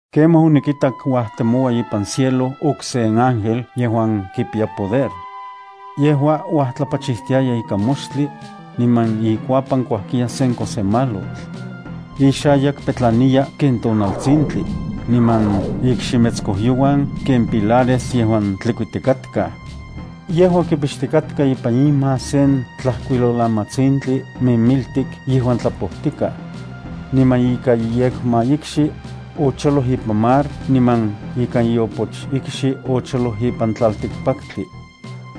Kemaj onikitak uajtemoua ipan cielo okse ángel yejuan kipiya poder. Yejua uajtlapachijtiaya ikan moxtli, niman ikuapan kuajkiya sen kojsemalotl. Ixayak petlaniya ken tonaltsintli, niman ikximetskojyouan ken pilares yejuan tlikuitikatkaj. Yejua kipixtikatka ipan ima sen tlajkuilolamatsintli mimiltik yejuan tlapojtikaj. Niman ika iyekmaikxi, ocholoj ipan mar, niman ika iopochikxi, ocholoj ipan tlaltikpaktli.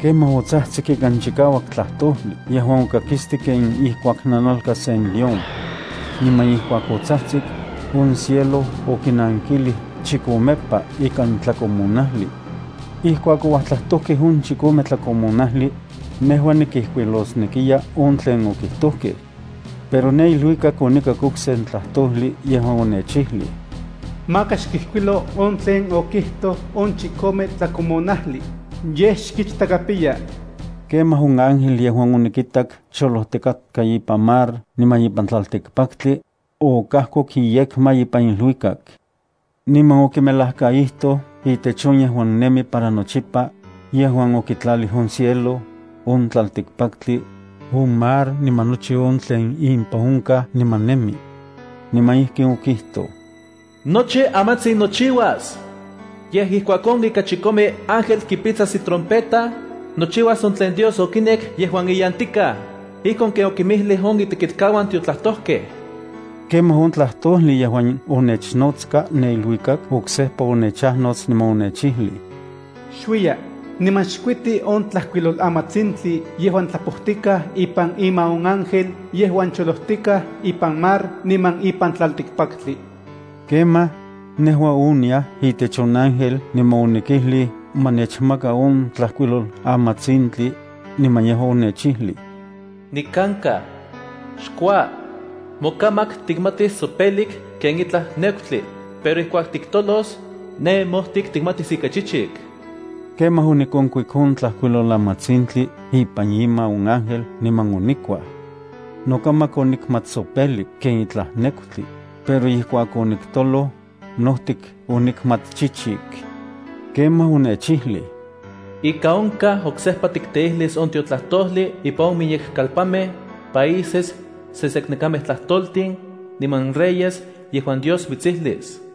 Kemaj otsajtsik ikan chikauak tlajtojli yejuan okakistik ken ijkuak nanalka sen león. Niman ijkuak otsajtsik, on cielo okinankilij chikomepa ikan tlakomonajli. Ijkuak ouajtlajtojkej on chikome tlakomonajli, nejua nikijkuilosnekiya on tlen okijtojkej. Pero ne iluikak onikak okse tlajtojli yejuan onechijlij: “Maka xkijkuilo on tlen okijtoj on chikome tlakomonajli, yej xkichtakapiya.” Kemaj on ángel yejuan onikitak cholojtikatka ipan mar niman ipan tlaltikpaktli, okajkoku iyekma ipan iluikak, niman okimelajkaijtoj itech on yejuan nemi para nochipa, yejuan okitlalij on cielo, on tlaltikpaktli, on mar niman nochi on tlen impan onkaj niman nemi. Niman ijkin okijtoj: “Nochi amantsin nochiuas. Yej, ijkuak on ika chikome ángel kipitsas itrompeta, nochiuas on tlen Dios okinek yejuan iyantikaj, ijkon ken okinmijlij on itekitkauan tiotlajtojkej.” Kemaj on tlajtojli yejuan onechajnotska ne iluikak oksejpa onechajnots niman onechijlij: “Xuiya, niman xkuiti on tlajkuilolamatsintli yejuan tlapojtikaj ipan ima on ángel yejuan cholojtikaj ipan mar niman ipan tlaltikpaktli.” Kemaj, nejua oniaj itech on ángel niman onikijlij ma nechmaka on tlajkuilolamatsintli, niman yejua onechijlij: “Nikankaj. Xkua. Mokamak tikmatis tsopelik ken itlaj nekutli, pero ijkuak tiktolos, ne mojtik tikmatis ika chichik.” Kemaj onikonkuik on tlajkuilolamatsintli ipan ima on ángel niman onikuaj. Nokamak onikmat tsopelik ken itlaj nekutli, pero ijkuak oniktoloj, nojtik onikmat chichik. Kemaj, onechijlij: “Ika onkaj oksejpa tikteijlis on tiotlajtojli impan on miyek kalpanmej, países, seseknekamej tlajtoltin niman reyes yejuan Dios mitsijlis.”